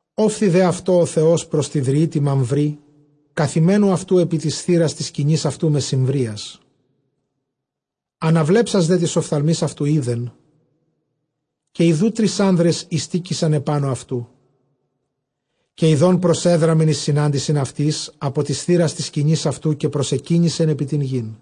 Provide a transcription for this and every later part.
Ὤφθη δὲ αὐτῷ ὁ Θεὸς πρὸς τῇ δρυῒ τῇ Μαμβρῇ, καθημένου αὐτοῦ ἐπὶ τῆς θύρας τῆς σκηνῆς αὐτοῦ μεσημβρίας. Ἀναβλέψας δὲ τοῖς ὀφθαλμοῖς αὐτοῦ εἶδε, καὶ ἰδοὺ τρεῖς ἄνδρες εἱστήκεισαν ἐπάνω αὐτοῦ· καὶ ἰδὼν, προσέδραμεν εἰς συνάντησιν αὐτοῖς ἀπὸ τῆς θύρας τῆς σκηνῆς αὐτοῦ, καὶ προσεκύνησεν ἐπὶ τὴν γῆν.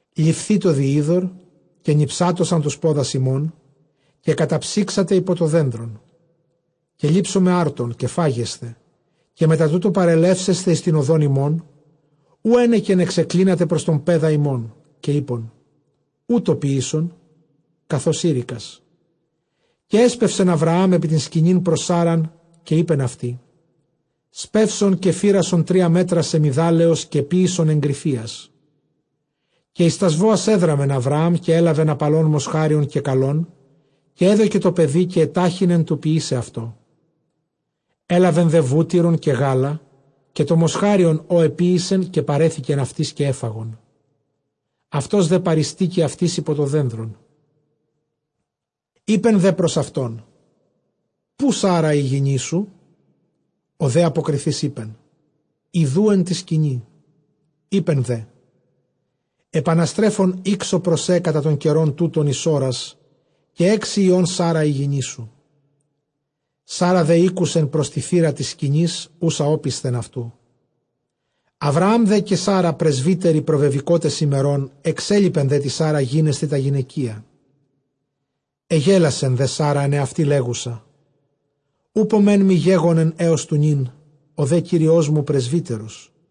Ληφθήτω δὴ ὕδωρ, καὶ νιψάτωσαν τοὺς πόδας ὑμῶν, καὶ καταψύξατε ὑπὸ τὸ δένδρον. Καὶ λήψομαι ἄρτον, καὶ φάγεσθε. Καὶ μετὰ τοῦτο παρελεύσεσθε εἰς τὴν ὁδὸν ὑμῶν, οὗ ἕνεκεν ἐξεκλίνατε πρὸς τὸν παῖδα ὑμῶν. Καὶ εἶπεν, οὕτω ποίησον, καθὼς εἴρηκας. Καὶ ἔσπευσεν Ἁβραὰμ ἐπὶ τὴν σκηνὴν πρὸς Σάῤῥαν, καὶ εἶπεν αὐτῇ, σπεῦσον, καὶ φύρασον τρία μέτρα σεμιδάλεως, καὶ ποίησον ἐγκρυφίας. Καὶ εἰς τὰς βόας ἔδραμεν Ἁβραὰμ, καὶ ἔλαβεν ἁπαλὸν μοσχάριον καὶ καλὸν, καὶ ἔδωκε τῷ παιδὶ, καὶ ἐτάχυνε τοῦ ποιῆσαι αὐτό. Ἔλαβε δὲ βούτυρον, καὶ γάλα, καὶ τὸ μοσχάριον ὃ ἐποίησε, καὶ παρέθηκεν αὐτοῖς, καὶ ἔφαγον· αὐτὸς δὲ παρειστήκει αὐτοῖς ὑπὸ τὸ δένδρον. Εἶπε δὲ πρὸς αὐτὸν, ποῦ Σάῤῥα ἡ γυνή σου; ὁ δὲ ἀποκριθεὶς εἶπεν, ἰδοὺ ἐν τῇ σκηνῇ. Εἶπε δὲ, ἐπαναστρέφων ἥξω πρὸς σὲ κατὰ τὸν καιρὸν τοῦτον εἰς ὥρας, καὶ ἕξει υἱὸν Σάῤῥα ἡ γυνή σου. Σάῤῥα δὲ ἤκουσε πρὸς τῇ θύρᾳ τῆς σκηνῆς οὖσα ὄπισθεν αὐτοῦ. Ἁβραὰμ δὲ καὶ Σάῤῥα πρεσβύτεροι προβεβηκότες ἡμερῶν· ἐξέλιπε δὲ τῇ Σάῤῥᾳ γίνεσθαι τὰ γυναικεια. Ἐγέλασε δὲ Σάῤῥα ἐν ἑαυτῇ λέγουσα, οὔπω μέν μοι γέγονεν ἕως τοῦ νῦν· ὁ δὲ κύριός μου πρεσβύτερος.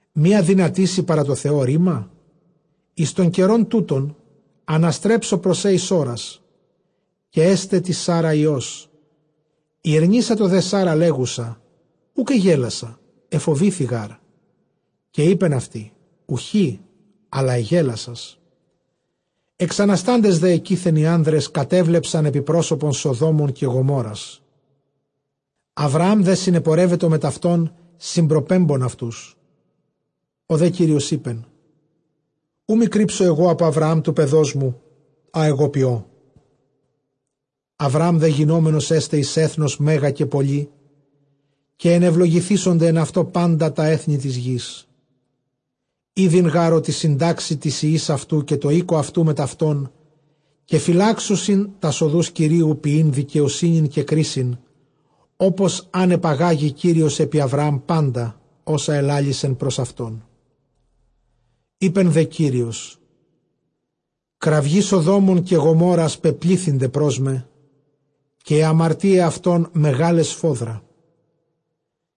Μὴ ἀδυνατήσει παρὰ τῷ Θεῷ ῥῆμα; εἰς τὸν καιρὸν τοῦτον ἀναστρέψω πρὸς σὲ εἰς ὥρας, καὶ ἔσται τῇ Σάῤῥᾳ υἱός. Ἠρνήσατο δὲ Σάῤῥα, λέγουσα, οὐκ ἐγέλασα· ἐφοβήθη γάρ. Καὶ εἶπεν αὐτῇ, οὐχὶ, ἀλλὰ ἐγέλασας. Ἐξαναστάντες δὲ ἐκεῖθεν οἱ ἄνδρες κατέβλεψαν ἐπὶ πρόσωπον Σοδόμων καὶ Γομόῤῥας. Ἁβραὰμ δὲ συνεπορεύετο μετʼ αὐτῶν, συμπροπέμπων αὐτούς. Ὁ δὲ Κύριος εἶπε, οὐ μὴ κρύψω ἐγὼ ἀπὸ Ἁβραὰμ τοῦ παιδός μου ἃ ἐγὼ ποιῶ. Ἁβραὰμ δὲ γινόμενος ἔσται εἰς ἔθνος μέγα καὶ πολὺ, καὶ ἐνευλογηθήσονται ἐν αὐτῷ πάντα τὰ ἔθνη τῆς γῆς. Ἤδειν γὰρ ὅτι συντάξει τοῖς υἱοῖς αὐτοῦ, καὶ τῷ οἴκῳ αὐτοῦ μετʼ αὐτὸν, καὶ φυλάξουσι τὰς ὁδοὺς Κυρίου, ποιεῖν δικαιοσύνην καὶ κρίσιν, ὅπως ἂν ἐπαγάγῃ Κύριος ἐπὶ Ἁβραὰμ πάντα ὅσα ἐλάλησε πρὸς αὐτόν. Εἶπε δὲ Κύριος, κραυγὴ Σοδόμων καὶ Γομόῤῥας πεπλήθυνται πρὸς μὲ, καὶ αἱ ἁμαρτίαι αὐτῶν μεγάλαι σφόδρα.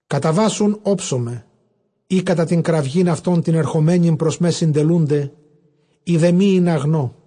Καταβὰς οὖν ὄψομαι, εἰ κατὰ τὴν κραυγὴν αὐτῶν τὴν ἐρχομενεην πρὸς μὲ, συντελοῦνται· εἰ δὲ μὴ, ἵνα γνῶ.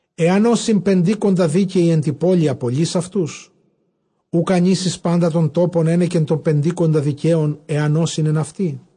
Ἐὰν ὦσι πεντήκοντα δίκαιοι ἐν τῇ πόλει, ἀπολεῖς αὐτούς; οὐκ ἀνήσεις πάντα τὸν τόπον ἕνεκεν τῶν πεντήκοντα δικαίων, ἐὰν ὦσιν ἐν αὐτῇ;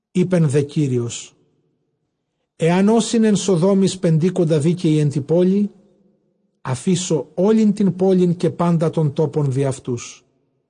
Εἶπε δὲ Κύριος, ἐὰν ὦσιν ἐν Σοδόμοις πεντήκοντα δίκαιοι ἐν τῇ πόλει, ἀφήσω ὅλην τὴν πόλιν, καὶ πάντα τὸν τόπον διʼ αὐτούς.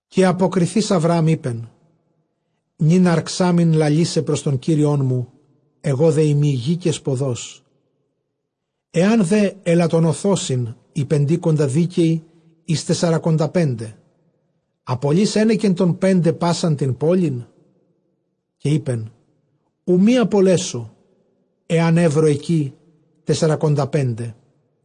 Καὶ ἀποκριθεὶς Ἁβραὰμ εἶπε, νῦν ἠρξάμην λαλῆσαι πρὸς τὸν Κύριόν μου· ἐγὼ δὲ εἰμὶ γῆ καὶ σποδός. Ἐὰν δὲ ἐλαττονωθῶσιν οἱ πεντήκοντα δίκαιοι εἰς τεσσαρακονταπέντε, ἀπολεῖς ἕνεκεν τῶν πέντε πᾶσαν τὴν πόλιν; καὶ εἶπεν, οὐ μὴ ἀπολέσω, ἐὰν εὕρω ἐκεῖ τεσσαρακονταπέντε.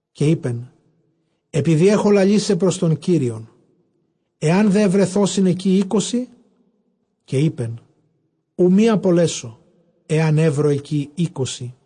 Καὶ εἶπεν, ἐπειδὴ ἔχω λαλῆσαι πρὸς τὸν Κύριον, ἐὰν δὲ εὑρεθῶσιν ἐκεῖ εἴκοσι; καὶ εἶπεν, οὐ μὴ ἀπολέσω, ἐὰν εὕρω ἐκεῖ εἴκοσι.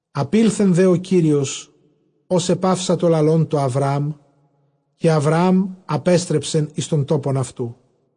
Ἀπῆλθε δὲ ὁ Κύριος, ὡς ἐπαύσατο λαλῶν τῷ Ἁβραάμ· καὶ Ἁβραὰμ ἀπέστρεψεν εἰς τὸν τόπον αὐτοῦ.